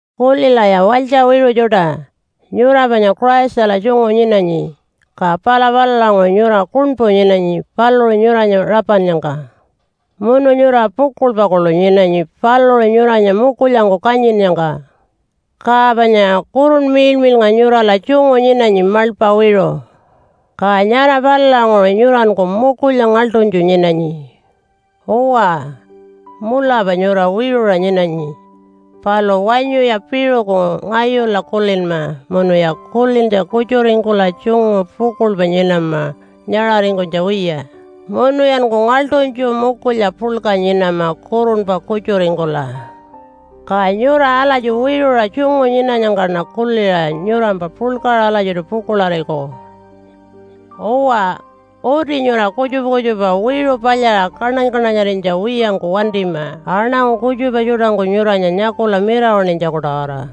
Kulilaya walytja wiṟu tjuṯa! Nyura panya Christala tjungu nyinanyi, ka pala palulanguṟu nyura kuṉpu nyinanyi paluṟu nyuranya rapannyangka. Munu nyura pukuḻpa kuḻu nyinanyi paluṟu nyuranya mukulyangku kanyinnyangka. Ka panya Kurunpa Miḻmiḻnga nyurala tjungu nyinanyi maḻpa wiṟu. Ka nyara palulanguṟu nyuranku mukulya ngaḻṯunytju nyinanyi. Uwa, mulapa nyura wiṟuṟa nyinanyi, palu wanyuya piṟuku ngayula kulinma munuya kulintja kutjuringkula tjungu pukuḻpa nyinama nyaṟaringkunytja wiya, munuyanku ngaḻṯunytju mukulya puḻka nyinama kurunpa kutjuringkula. Ka nyura alatji wiṟuṟa tjungu nyinanyangkaṉa kuliṟa nyurampa puḻkaṟa alatjiṯu pukuḻariku. Uwa, uti nyura kutjupa kutjupa wiṟu palyaṟa kaṉany-kaṉanyarinytja wiyangku wantima aṉangu kutjupa tjuṯangku nyuranya nyakula mirawaṉinytjaku-tawara.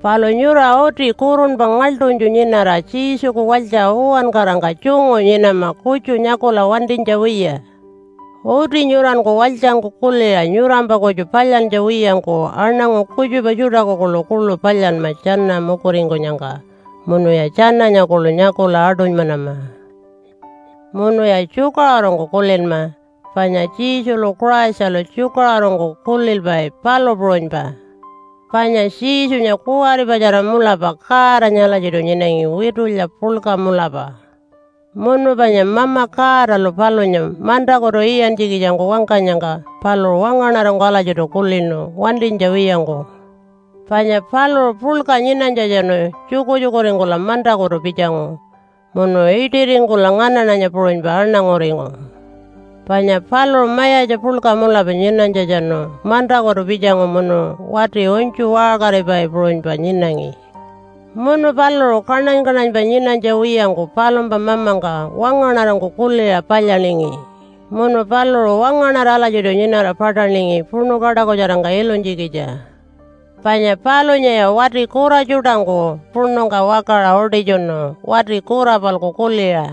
Palu nyura uti kurunpa ngaḻṯunytju nyinara Jesuku walytja uwankarangka tjungu nyinama kutju nyakula wantinytja wiya. Uti nyuranku walytjangku kuliṟa nyurampa kutju palyantja wiyangku aṉangu kutjupa tjuṯaku kuḻukuḻu palyanma tjana mukuringkunyangka, munuya tjananya kuḻu nyakula aṯunymanama. Munuya tjukaṟurungku kulinma, panya Jesulu Christalu tjukaṟurungku kulilpai, palu puṟunypa. Panya Jesunya kuwaripatjara mulapa Godanya alatjiṯu nyinangi witulya puḻka mulapa. Munu panya Mama Godalu palunya mantakutu iyantjikitjangku wangkanyangka paluṟu wangaṉarangku alatjiṯu kulinu wantinytja wiyangku. Panya paluṟu puḻka nyinanytjatjanu tjukutjukuringkula mantakutu pitjangu, munu iṯiringkula nganaṉanya puṟunypa aṉanguringu. Panya paluṟu mayatja puḻka mulapa nyinanytjatjanu mantakutu pitjangu munu wati unytju waṟkaripai puṟunypa nyinangi. Munu paluṟu kaṉany-kaṉanypa nyinanytja wiyangku palumpa Mamangka wangaṉarangku kuliṟa palyaningi, munu paluṟu wangaṉara alatjiṯu nyinara paṯaningi puṉu kaṯakutjarangka ilunytjikitja. Panya palunyaya wati kura tjuṯangku puṉungka wakaṟa utitjunu wati kura-palku kuliṟa.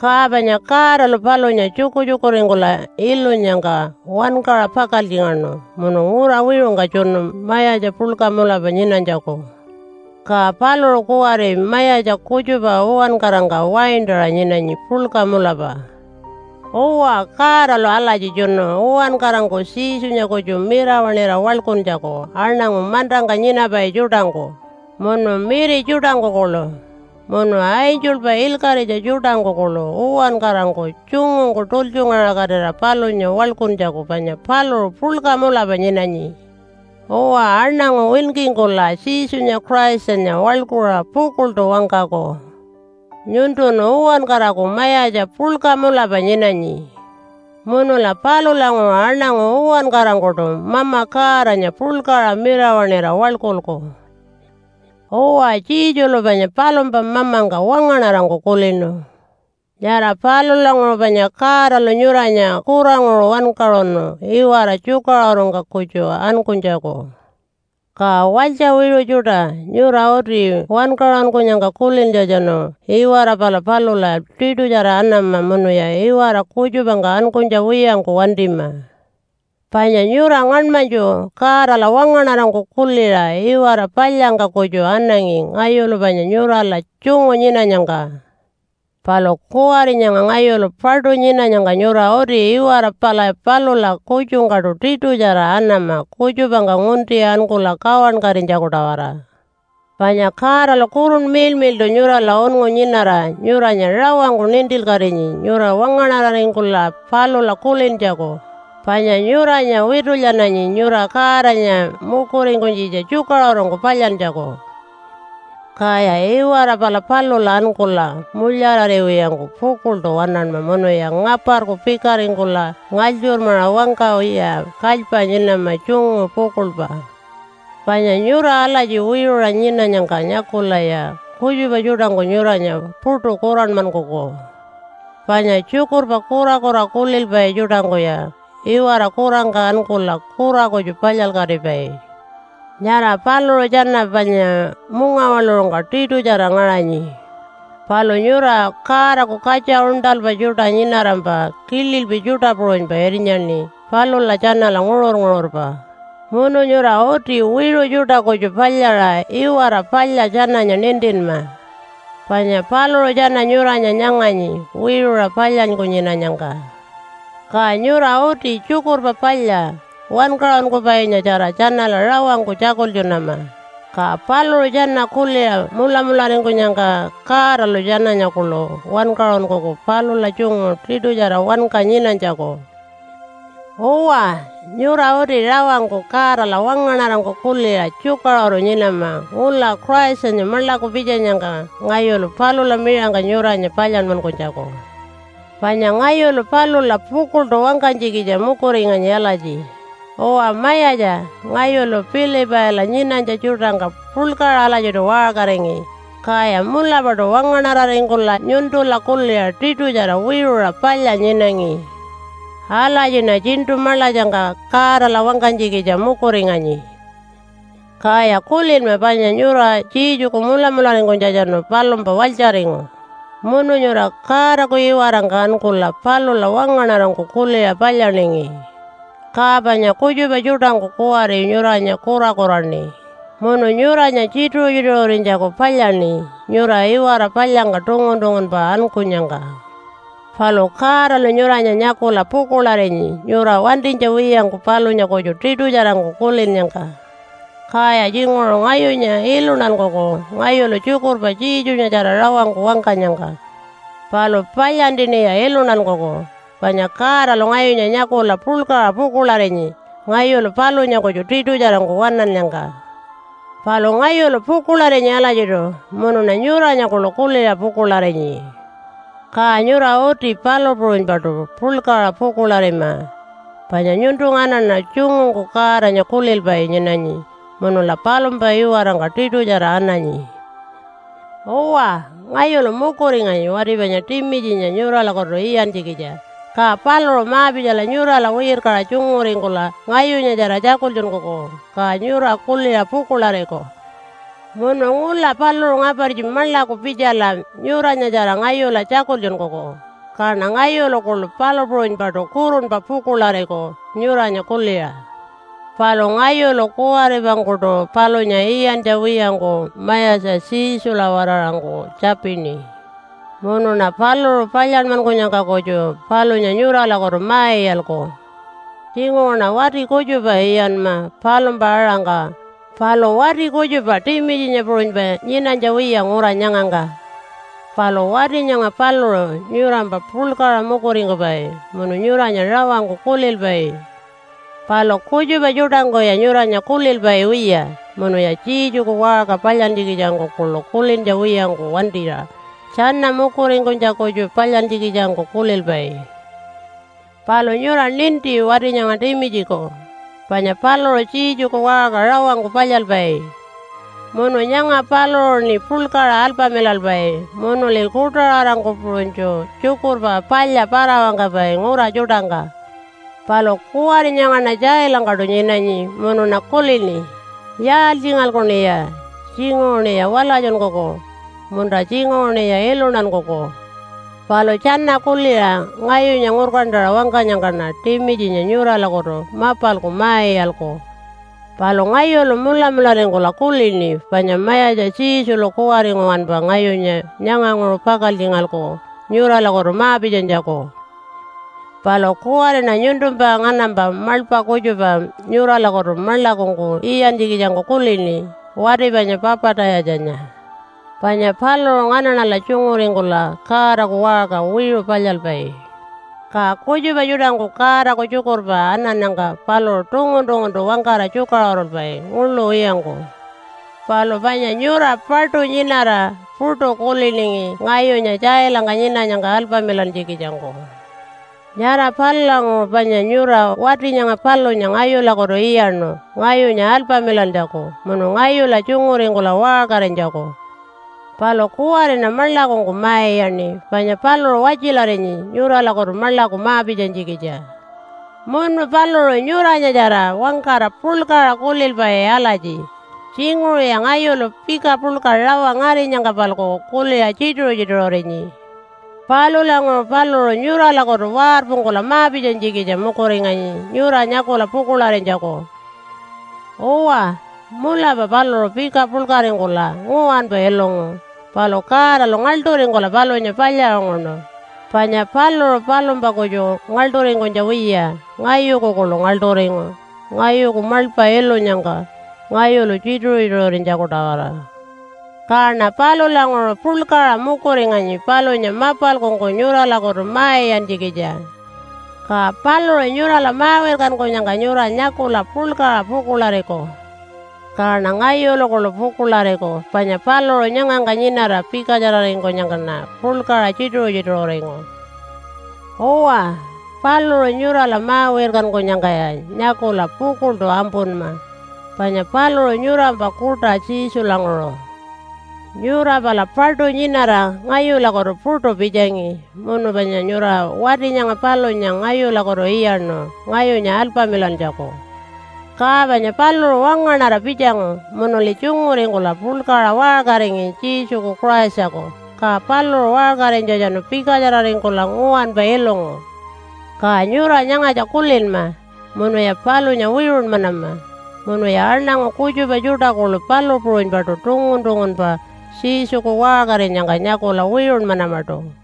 Ka panya Godalu palunya tjukutjukuringkula ilunyangka wankaṟa pakaltjingaṉu munu ngura wiṟungka tjunu mayatja puḻka mulapa nyinanytjaku. Ka paluṟu kuwari mayatja kutjupa uwankarangka waintaṟa nyinanyi puḻka mulapa. Uwa, Godalu alatji tjunu uwankarangku Jesunya kutju mirawaṉira waḻkuntjaku aṉangu mantangka nyinapai tjuṯangku, munu miri tjuṯangku kuḻu, munu angelpa ilkaṟitja tjuṯangku kuḻu uwankarangku tjungungku tultjungaṟakatira palunya waḻkuntjaku panya paluṟu puḻka mulapa nyinanyi. Uwa, aṉangu winkingkula Jesunya Christanya waḻkuṟa pukuḻṯu wangkaku, “Nyuntun uwankaraku Mayatja puḻka mulapa nyinanyi.” Munula palulanguṟu aṉangu uwankarangkuṯu Mama Godanya puḻkaṟa mirawaṉira waḻkulku. Uwa, Jesulu panya palumpa Mamangka wangaṉarangku kulinu. Nyara palulanguṟu panya Godalu nyuranya kuranguṟu wankaṟunu iwara tjukaṟurungka kutju ankunytjaku. Ka walytja wiṟu tjuṯa, nyura uti wankaṟunkunyangka kulintjatjanu iwara pala palula tiṯutjara anama munuya iwara kutjupangka ankunytja wiyangku wantima. Panya nyura ngaṉmanytju Godala wangaṉarangku kuliṟa iwara palyangka kutju anangi ngayulu panya nyurala tjungu nyinanyangka. Palu kuwari nyanga ngayulu paṯu nyinanyangka nyura uti iwara pala palula kutjungkaṯu tiṯutjara anama kutjupangka ngunti ankula kawankatinytjaku-tawara. Panya Godalu Kurunpa Miḻmiḻṯu nyurala unngu nyinara nyuranya rawangku nintilkatinyi nyura wangaṉararingkula palula kulintjaku, panya nyuranya witulyananyi nyura Godanya mukuringkunytjitja tjukaṟurungku palyantjaku. Kaya iwara pala palula ankula mulyarariwiyangku pukuḻṯu waṉanma munuya ngaparku pikaringkula ngalytjurmaṟa wangkawiya kalypa nyinama tjungu pukuḻpa. Panya nyura alatji wiṟuṟa nyinanyangka nyakulaya kutjupa tjuṯangku nyuranya puṯu kuranmankuku. Panya tjukurpa kurakura kulilpai tjuṯangkuya iwara kurangka ankula kura kutju palyalkatipai. Nyara paluṟu tjana panya mungawaḻuṟungka tiṯutjara ngaṟanyi. Palu nyura Godaku katja uṉṯalpa tjuṯa nyinarampa kililpi tjuṯa puṟunypa irnyaṉi palula tjanala nguṟur-nguṟurpa munu nyura uti wiṟu tjuṯa kutju palyaṟa iwara palya tjananya nintinma. Panya paluṟu tjana nyuranya nyanganyi wiṟuṟa palyanyku nyinanyangka. Ka nyura uti Tjukurpa Palya Wankaṟunkupainyatjara tjanala rawangku tjakultjunama, ka paluṟu tjana kuliṟa mulamularingkunyangka Godalu tjananya kuḻu wankaṟunkuku palula tjungu tiṯutjara wanka nyinanytjaku. Uwa, nyura uti rawangku Godala wangaṉarangku kuliṟa tjukaṟuru nyinama ngula Christanya maḻaku pitjanyangka ngayulu palula miṟangka nyuranya palyanmankunytjaku. Panya ngayulu palula pukuḻṯu wangkanytjikitja mukuringanyi alatji, “Uwa Mayatja, ngayulu Pilipaila nyinanytja tjuṯangka puḻkaṟa alatjiṯu waṟkaringi, kaya mulapaṯu wangaṉararingkula nyuntula kuliṟa tiṯutjara wiṟuṟa palya nyinangi.” Alatjiṉa tjiṉṯu maḻatjangka Godala wangkanytjikitja mukuringanyi. Kaya kulinma panya nyura Jesuku mulamularingkunytjatjanu palumpa walytjaringu, munu nyura Godaku iwarangka ankula palula wangaṉarangku kuliṟa palyaningi. Ka panya kutjupa tjuṯangku kuwari nyuranya kurakuraṉi munu nyuranya tjituṟu-tjituṟurinytjaku palyaṉi nyura iwara palyangka tungun-tungunpa ankunyangka. Palu Godalu nyuranya nyakula pukuḻarinyi nyura wantinytja wiyangku palunya kutju tiṯutjarangku kulinnyangka. Kaya tjinguṟu ngayunya iluntankuku ngayulu tjukurpa Jesunyatjara rawangku wangkanyangka. Palu palyantiṉiya iluntankuku, panya Godalu ngayunya nyakula puḻkaṟa pukuḻarinyi ngayulu palunya kutju tiṯutjarangku waṉannyangka. Palu ngayulu pukuḻarinyi alatjiṯu, munuṉa nyuranya kuḻu kuliṟa pukuḻarinyi. Ka nyura uti palu puṟunypaṯu puḻkaṟa pukuḻarima, panya nyuntu nganaṉa tjungungku Godanya kulilpai nyinanyi munula palumpa iwarangka tiṯutjara ananyi. Uwa, ngayulu mukuringanyi wati panya Timitjinya nyuralakutu iyantjikitja, ka paluṟu ma-pitjala nyurala wirkaṟa tjunguringkula ngayunyatjara tjakultjunkuku, ka nyura kuliṟa pukuḻariku. Munu ngula paluṟu ngapartji maḻaku pitjala nyuranyatjara ngayula tjakultjunkuku, kaṉa ngayulu kuḻu palu puṟunypaṯu kurunpa pukuḻariku nyuranya kuliṟa. Palu ngayulu kuwaripangkuṯu palunya iyantja wiyangku Mayatja Jesula-waraṟangku tjapini. Munuṉa paluṟu palyanmankunyangka kutju palunya nyuralakutu ma-iyalku. Tjinguṟuṉa wati kutjupa iyanma palumpa aṟangka, palu wati kutjupa Timitjinya puṟunypa nyinanytja wiya ngura nyangangka. Palu wati nyanga paluṟu nyurampa puḻkaṟa mukuringkupai munu nyuranya rawangku kulilpai. Palu kutjupa tjuṯangkuya nyuranya kulilpai wiya, munuya Jesuku waṟka palyantjikitjangku kuḻu kulintja wiyangku wantira tjana mukuringkunytja kutju palyantjikitjangku kulilpai. Palu nyura ninti wati nyanga Timitjiku, panya paluṟu Jesuku waṟka rawangku palyalpai. Munu nyanga paluṟuṉi puḻkaṟa alpamilalpai munuli kuṯaṟarangku puṟunytju Tjukurpa Palya para-wangkapai ngura tjuṯangka. Palu kuwari nyangaṉa tjailangkaṯu nyinanyi munuṉa kulini, “Yaaltjingalkuṉiya? Tjinguṟuṉiya walatjunkuku, munta tjinguṟuṉiya iluntankuku.” Palu tjana kuliṟa ngayunya ngurkantaṟa wangkanyangkaṉa Timitjinya nyuralakutu mapalku ma-iyalku. Palu ngayulu mulamularingkula kulini panya Mayatja Jesulu kuwari nguwanpa ngayunya nyanganguṟu pakaltjingalku nyuralakutu ma-pitjanytjaku. Palu kuwariṉa nyuntumpa nganampa maḻpa kutjupa nyuralakutu maḻakungku iyantjikitjangku kulini, wati panya Papa-tayatjanya. Panya paluṟu nganaṉala tjunguringkula Godaku waṟka wiṟu palyalpai. Ka kutjupa tjuṯangku Godaku tjukurpa anannyangka paluṟu tungun-tunguntu wangkara tjukaṟurulpai nguḻu wiyangku. Palu panya nyura paṯu nyinara puṯu kuliningi ngayunya tjailangka nyinanyangka alpamilantjikitjangku. Nyara palulanguṟu panya nyura wati nyanga palunya ngayulakutu iyaṉu ngayunya alpamilantjaku munu ngayula tjunguringkula waṟkarinytjaku. Palu kuwariṉa maḻakungku ma-iyaṉi, panya paluṟu watjilarinyi nyuralakutu maḻaku ma-pitjanytjikitja. Munu paluṟu nyuranyatjara wangkara puḻkaṟa kulilpai alatji, “Tjinguṟuya ngayulu pika puḻka rawa ngarinyangka-palku kuliṟa tjituṟu-tjituṟurinyi.” Palulanguṟu paluṟu nyuralakutu warpungkula ma-pitjanytjikitja mukuringanyi nyura nyakula pukuḻarinytjaku. Uwa, mulapa paluṟu pika puḻkaringkula nguwanpa ilungu. Palu Godalu ngaḻṯuringkula palunya palyaṟunguṉu, panya paluṟu palumpa kutju ngaḻṯuringkunytja wiya, ngayuku kuḻu ngaḻṯuringu ngayuku maḻpa ilunyangka ngayulu tjituṟu-tjituṟurinytjaku-tawara. Kaṉa palulanguṟu puḻkaṟa mukuringanyi palunya mapalkungku nyuralakutu ma-iyantjikitja. Ka paluṟu nyurala ma-wirkankunyangka nyura nyakula puḻkaṟa pukuḻariku. Kaṉa ngayulu kuḻu pukuḻariku panya paluṟu nyangangka nyinara pikatjararingkunyangkaṉa puḻkaṟa tjituṟu-tjituṟuringu. Uwa, paluṟu nyurala ma-wirkankunyangkaya nyakula pukuḻṯu ampunma, panya paluṟu nyurampa kuṯa Jesulanguṟu. Nyura pala paṯu nyinara ngayulakutu puṯu pitjangi munu panya nyura wati nyanga palunya ngayulakutu iyaṉu ngayunya alpamilantjaku. Ka panya paluṟu wangaṉara pitjangu munuli tjunguringkula puḻkaṟa waṟkaringi Jesuku Christaku. Ka paluṟu waṟkarinytjatjanu pikatjararingkula nguwanpa ilungu. Ka nyura nyangatja kulinma munuya palunya wiṟunmanama munuya aṉangu kutjupa tjuṯa kuḻu palu puṟunypaṯu tungun-tungunpa Jesuku waṟkarinyangka nyakula wiṟunmanamaṯu.